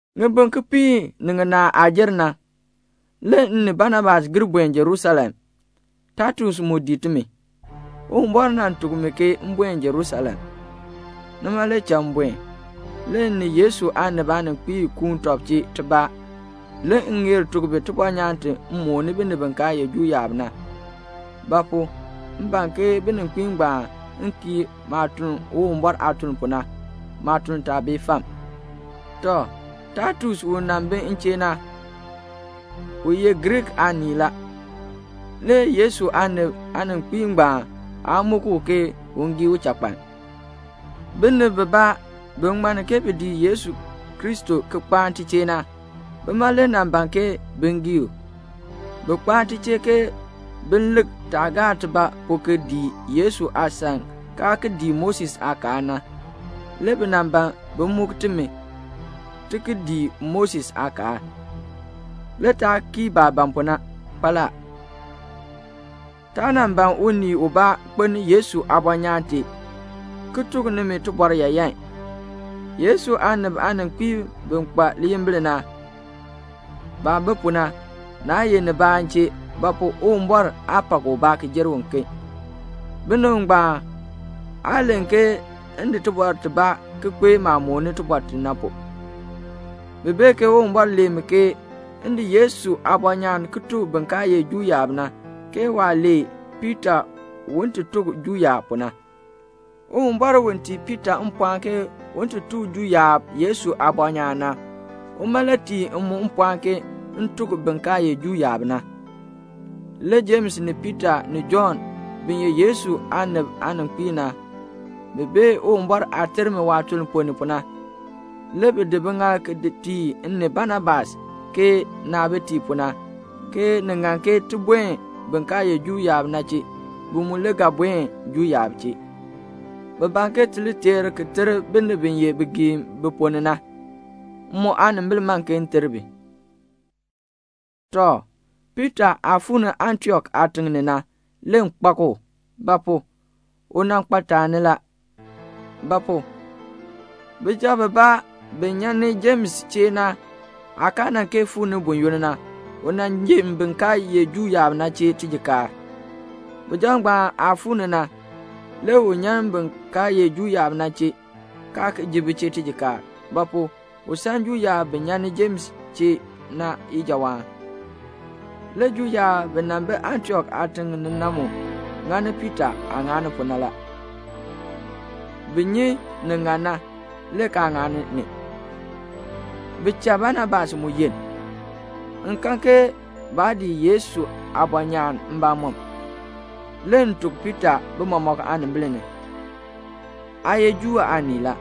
Ŋibin kipiik ni ŋinaa aah jer na, le m ni Banabas gir buen Jerusalem. Taitus mu dii timi. Uwumbɔr nan tuk mi ke m buen Jerusalem. Nima le cha m buen. Le m ni Yesu aanib aaninkpiib kuun tɔb chee tibaa, le m ŋeer tuk bi tibɔnyaan ti m mooni binib bi kaa ye Juu yaab na; ba pu? m ban ke bininkpiib ngbaan kii maah tun Uwumbɔr aatuln pu na, maatuln taa bee fam. Tɔ, Taitus u nan bi m chee na, u ye Griik aanii la. Le Yesu aanib aaninkpiib ngbaan aa muk u ke un gii uchakpaln. Binib bibaa bi ŋmanni ke bi dii Yesu Kristo ki kpaan ti chee na, bima le nan ban ke bin gii u. Bi kpaan ti chee ke bi lik taah gaa tibaa pu ki dii Yesu aasan kaa ki dii Moses aakaal na. Le bi nan ban bin muk timi ti ki dii Moses aakaal. Le taa kii baah ban pu na kpaala. Taa nan ban unii ubaa kpeln Yesu aabɔnyaan tee ki tuk nimi tibɔr yaayan. Yesu aanib aaninkpiib bi kpa liyimbil na, (baah bi pu na, naa ye nibaa m chee; ba pu? Uwumbɔr aa pak ubaa ki jer uken,) binib ngbaan aa len ke m di tibɔr tibaa ki kpee maah mooni tibɔr ti na pu. Bi bee ke Uwumbɔr lee mi ke m di Yesu aabɔnyaan ki tuk bin kaa ye Juu yaab na, ke waah nan lee Piita un ti tuk Juu yaab pu na. Uwumbɔr u tii Piita mpɔɔn ke un ti tuk Juu yaab Yesu aabɔnyaan na, uma le tii m mu mpɔɔn ke m tuk bin kaa ye Juu yaab na. Le Jems ni Piita ni Jɔnn bi ye Yesu aanib aaninkpiib na, bi bee Uwumbɔr aah ter mi waatuln ponn ni pu na, le bi di biŋaal ki tii m ni Banabas ke naabitiib pu na, ke ni ŋan ke ti buen bin kaa ye Juu yaab na chee, bi mu le ga buen Juu yaab chee. Bi ban ke ti li teer ki ter binib bi ye bigiim bi ponn ni na. M mu aanimbil man ke m ter bi. Tɔ, Piita aah fuu ni Antiok aatiŋ ni na, le m kpak u; ba pu? u nan kpa taani la; ba pu? bijab bibaa bi nyan ni Jems chee na aa nan kee fuu ni buyoonn na, u nan jin bin kaa ye Juu yaab na chee tijikaar. Bijab ngbaan aah fuu ni na, le u nyan bin kaa ye Juu yaab na chee, kaa ki ji bi chee tijikaar; ba pu? u san Juu yaab bi nyan ni Jems chee na ijawaan. Le Juu yaab bi nan bi Antiok aatiŋ ni na mu ŋani Piita aah ŋa pu na la. Bi nyi nin ŋan na, le kaa ŋani ni. Bi cha Banabas mu yenn. M kan ke baa dii Yesu aabɔnyaan mbamɔm. Le m tuk Piita bi mɔmɔk aanimbil ni, "Aa ye Juu aanii la.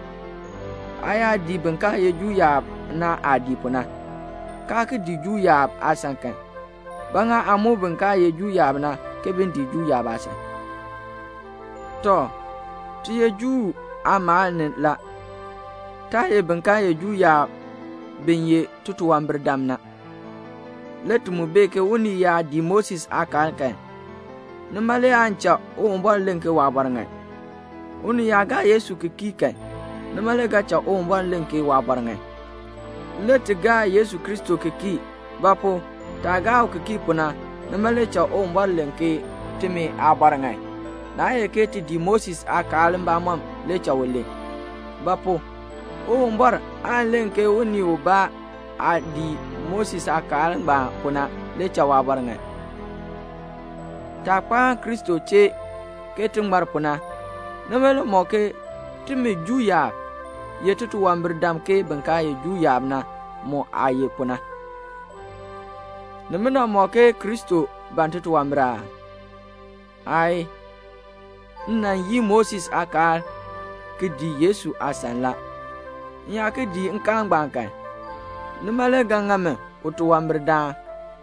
Aa yaa dii bin kaa ye Juu yaab na aah dii pu na, kaa ki dii Juu yaab aasan kan, ba ŋa aa muk bin kaa ye Juu yaab na ke bin dii Juu yaab aasan?" Tɔ, ti ye Juu aamaal ni la. Taa ye bin kaa ye Juu yaab bi ye titunwambirdam na; le ti mu bee ke unii yaa dii Moses aakaal kan, nima le aan cha Uwumbɔr len ke waabɔr ŋan. Unii yaa gaa Yesu Kristo ki kii kan, nima le ga cha Uwumbɔr len ke waabɔr ŋan. Le ti gaa Yesu Kristo ki kii; ba pu? taah gaa u ki kii pu na, nima le cha Uwumbɔr len ke timi aabɔr ŋan, naa ye ke ti dii Moses aakaal mbamɔm le cha u len; ba pu? Uwumbɔr aan len ke unii ubaa aah dii nkaal ngbaan pu na le cha waabɔr ŋan. Taah kpaan Kristo chee ke ti ŋmar pu na, nima le mɔk ke timi Juu yaab ye titunwambirdam ke bin kaa ye Juu yaab na mu aah ye pu na. Nimina ŋmɔk ke Kristo ban titunwambir aa? Aayii. M nan yii Moses aakaal ki dii Yesu aasan la. M yaa ki dii nkaal ngbaan kan, nima le ga ŋa mi utunwambirdaan.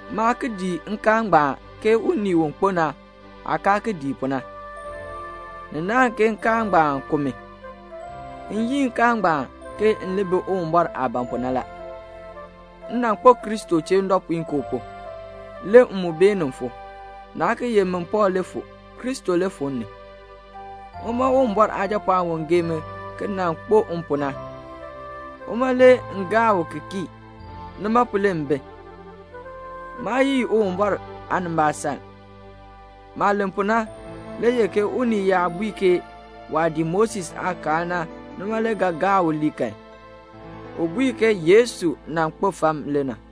Maa ki dii nkaal ngbaan ke unii u kpo na aah kaa ki dii pu na. Ni naahn ke nkaal ngbaan ku mi. M yii nkaal ngbaan ke m li bi Uwumbɔr aah ban pu na la. M nan kpo Kristo chee ndɔpuinkoo pu, le m mu beenin fu; naa ki ye min Pɔɔl le fu. Kristo le fu m ni. Uma Uwumbɔr Aajapɔɔn u gee mi ki nan kpo m pu na, uma le m gaa u ki kii; nima pu le m bi. Maa yii Uwumbɔr aanimbaasaln. Maah len pu na le ye ke unii yaa bui ke waah dii Moses aakaal na nima le ga cha u ŋmar kan, u bui ke Yesu nan kpo fam le na.